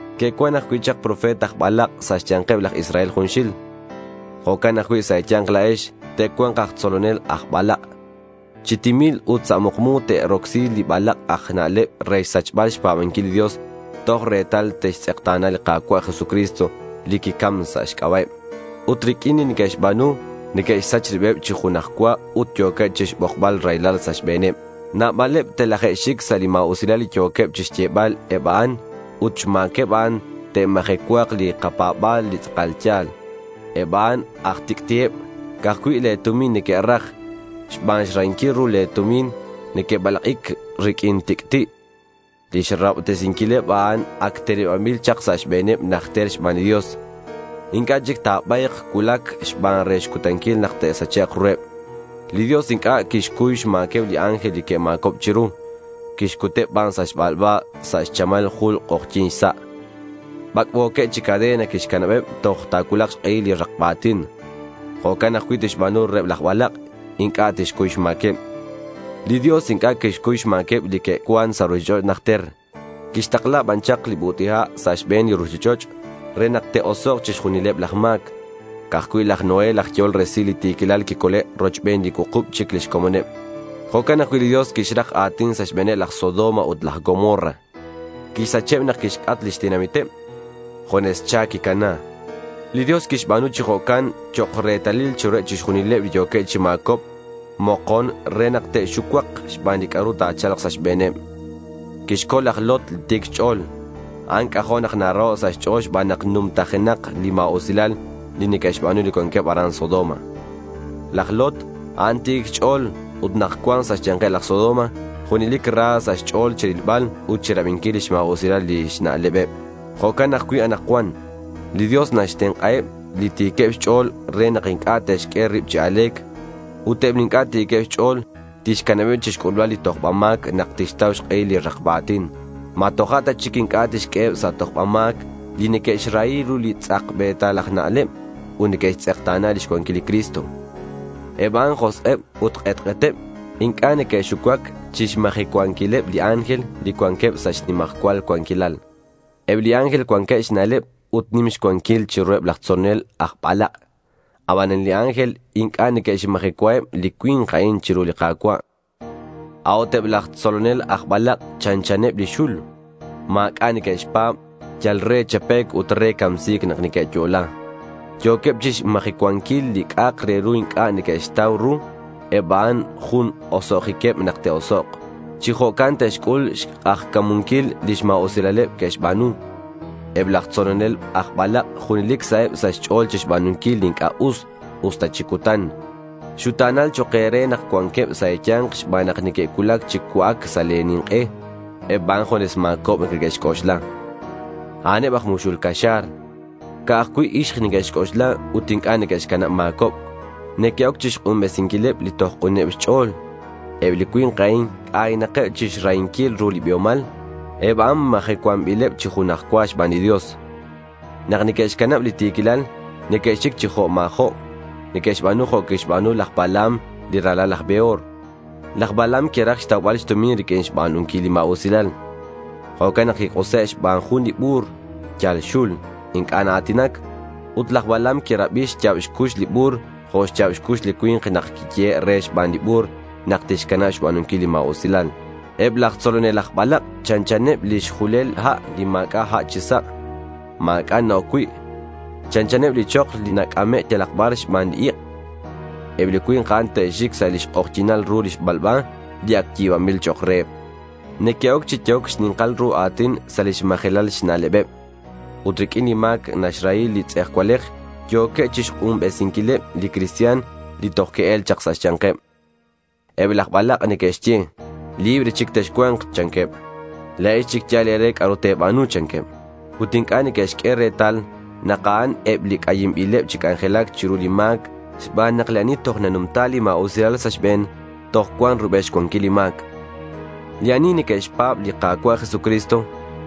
Que'cuan ajcui' chak profeta aj balak' sa' xya̱nkeb laj Israel junxil. Jo'can ajcui' sa' e̱ya̱nk la̱ex, te'cua̱nk aj tzolonel aj balak'. Chi timil ut sa' mukmu te'rocsi li balak' aj na'leb re xsachbal xpa̱banquil li Dios toj retal te'xtz'ekta̱na li Ka̱cua' Jesucristo li quicam sa' xc'aba'eb. Ut riq'uin li neque'xba̱nu, neque'xsach ribeb chi junaj cua ut yo̱queb chixbokbal raylal sa' xbe̱neb. Nabaleb telaje'xic sa' li ma̱usilal li yo̱queb chixyebal eb a'an ut xma̱queb a'an ta̱majecua̱k li kapa̱ba̱l li tz'akal ya̱l. Eb a'an aj tic'ti'eb. Ca'aj cui' le̱ tumin neque'raj. Xban xrahinquil ru li tumin neque'balak'ic riq'uin tic'ti'. Lix rahobtesinquileb a'an ac tenebanbil chak sa' xbe̱neb najter xban li Dios. Inc'a' chic ta̱ba̱yk. Cuulac ban re xcutanquil nak te'sachek' ruheb. Li Dios inc'a' quixcuy xma̱queb li ángel li que'ma̱cob chiru. Quixcuteb ban sa' xbalba sa' chamal jul k'ojyi̱n xsa'. Bac'bo̱queb chi cadena quixcanabeb toj ta̱cuulak xk'ehil li rakba a̱tin. Jo'can ajcui' tixba̱nu reheb laj balak'. Inc'a' tixcuy xma̱queb. Li Dios inc'a' quixcuy xma̱queb li que'cuan sa' ruchich'och' najter. Quixtakla ban chak li but'i ha' sa' xbe̱n li ruchich'och' re nak te'osok' chixjunileb laj ma̱c. Ca'aj cui' laj Noé laj yehol resil li ti̱quilal quicole' rochbeneb li cuukub chic lix comoneb. Jo'can ajcui' li Dios quixrak a̱tin sa' xbe̱neb laj Sodoma ut laj Gomorra. Quixsacheb nak quixc'at lix tenamiteb. Junes cha quicana. Li Dios quixba̱nu chi jo'can chok' retalil chiruheb chixjunileb li yo̱keb chi ma̱cobc mokon re nak te'xucuak xban li c'a'ru ta̱cha̱lk sa' xbe̱neb. Quixcol laj Lot li ti̱c xch'o̱l. A'an c'ajo' nak naraho' sa' xch'o̱l xban nak numtajenak li ma̱usilal li neque'xba̱nu li cuanqueb aran Sodoma. Laj Lot, a'an ti̱c xch'o̱l. Ut nak cuan sa' xya̱nkeb laj Sodoma junelic ra sa' xch'o̱l chirilbal, ut chirabinquil lix ma̱usilal lix na'lebeb. Jo'can ajcui' anakcuan. Li Dios naxtenk'aheb li ti̱queb xch'o̱l re nak inc'a' te'xq'ue rib chi a̱le̱c. Ut eb li inc'a' ti̱queb xch'o̱l tixcanabeb chixc'ulbal li tojba ma̱c nak tixtau xk'ehil li rakba a̱tin. ¿Ma toja' ta chic inc'a' tixq'ueheb sa' tojba ma̱c li neque'xrahi ru li tz'ajbe̱tal aj na'leb ut neque'xtz'ekta̱na lix cuanquilal li Cristo? Eb a'an josk'eb ut k'etk'eteb. Inc'a' neque'xucuac chixmajecuanquileb li ángel li cuanqueb sa' xnimajcual cuanquilal. Eb li ángel cuanqueb xna'leb ut nim xcuanquil chiruheb laj tzolonel aj balak'. Abanan li ángel inc'a' neque'xmajecuaheb li cui̱nk a'in chiru li Ka̱cua'. A'ut eb laj tzolonel aj balak' chanchaneb li xul. Ma̱c'a' neque'xpa̱b. Yal re chapec' ut re camsi̱c nak neque'yo'la. Yo̱queb chixmajecuanquil li c'a'ak re ru inc'a' neque'xtau ru. Eb a'an jun oso'jiqueb nak te'osok'. Chi jo'can te'xc'ul xk'ajca̱munquil lix ma̱usilaleb que'xba̱nu. Eb laj tzolonel aj balak' junelic saheb sa' xch'o̱l chixba̱nunquil li inc'a' us, usta chi cutan. Xuta̱nal chok' e̱re nak cuanqueb sa' e̱ya̱nk xban nak neque'cuulac chi cua'ac sa' le̱ nink'e. Eb a'an junes ma̱cobc neque'xc'oxla. A'aneb aj muxul caxa̱r. Ca'aj cui' ixk neque'xc'oxla ut inc'a' neque'xcanab ma̱cobc. Neque'oc chixk'unbesinquileb li toj k'uneb xch'o̱l. Eb li cui̱nk a'in c'aynakeb chixrahinquil ru li biomal. Eb a'an majecuanbileb chi junaj cua xban li Dios. Nak neque'xcanab li ti̱quilal, neque'xic chi jo' ma̱jo'. Neque'xba̱nu jo' quixba̱nu laj Balaam li ralal laj Beor. Laj Balaam quiraj xtaubal xtumin riq'uin xba̱nunquil li ma̱usilal. Jo'can nak quik'use' xban jun li bu̱r. Yal xul. Inc'a' naa̱tinac. Ut laj Balaam quirabi xya̱b xcux li bu̱r jo' xya̱b xcux li cui̱nk nak quiyehe' re xban li bu̱r nak tixcanab xba̱nunquil li ma̱usilal. Eb laj tzolonel aj balak' chanchaneb lix julel ha' li ma̱c'a' ha' chi sa'. Ma̱c'a' na-oc cui'. Chanchaneb li chok li nac'ame' yalak bar xban li ik'. Eb li cui̱nk a'in te'xic sa' lix k'ojyi̱nal ru li xbalba li ac yi̱banbil chok' reheb. Neque'oc chi yehoc xni̱nkal ru a̱tin sa' lix majelal xna'lebeb. Ut riq'uin li ma̱c naxrahi li tz'ejcualej yo̱queb chixk'unbesinquileb li cristian li toj que'el chak sa' xya̱nkeb. Eb laj balak' neque'xye: Libre chic texcua̱nk, chanqueb. La̱ex chic yal e̱re c'a'ru te̱ba̱nu, chanqueb. Ut inc'a' neque'xq'ue retal nak a'an eb li c'ayinbileb chi c'anjelac chiru li ma̱c xban nak li ani toj nanumta li ma̱usilal sa' xbe̱n, toj cuan rubel xcuanquil li ma̱c. Li ani neque'xpa̱b li Ka̱cua' Jesucristo,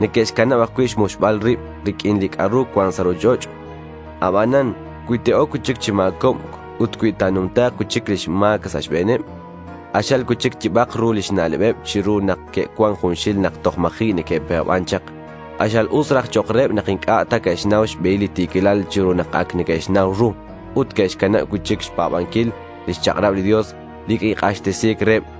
neque'xcanab ajcui' xmuxbal rib riq'uin li c'a'ru cuan sa' ruchich'och'. Abanan cui te'oc cui'chic chi ma̱cobc ut cui ta̱numta̱k cui'chic li ma̱c sa' xbe̱neb, k'axal cui'chic yibak ru lix na'lebeb chiru nak que'cuan junxil nak toj ma̱ji' neque'pa̱ban chak. K'axal us raj chok' reheb nak inc'a' ta que'xnau xbehil li ti̱quilal chiru nak ac neque'xnau ru, ut que'xcanab cui'chic xpa̱banquil lix chak'rab li Dios li quik'axtesi̱c reheb.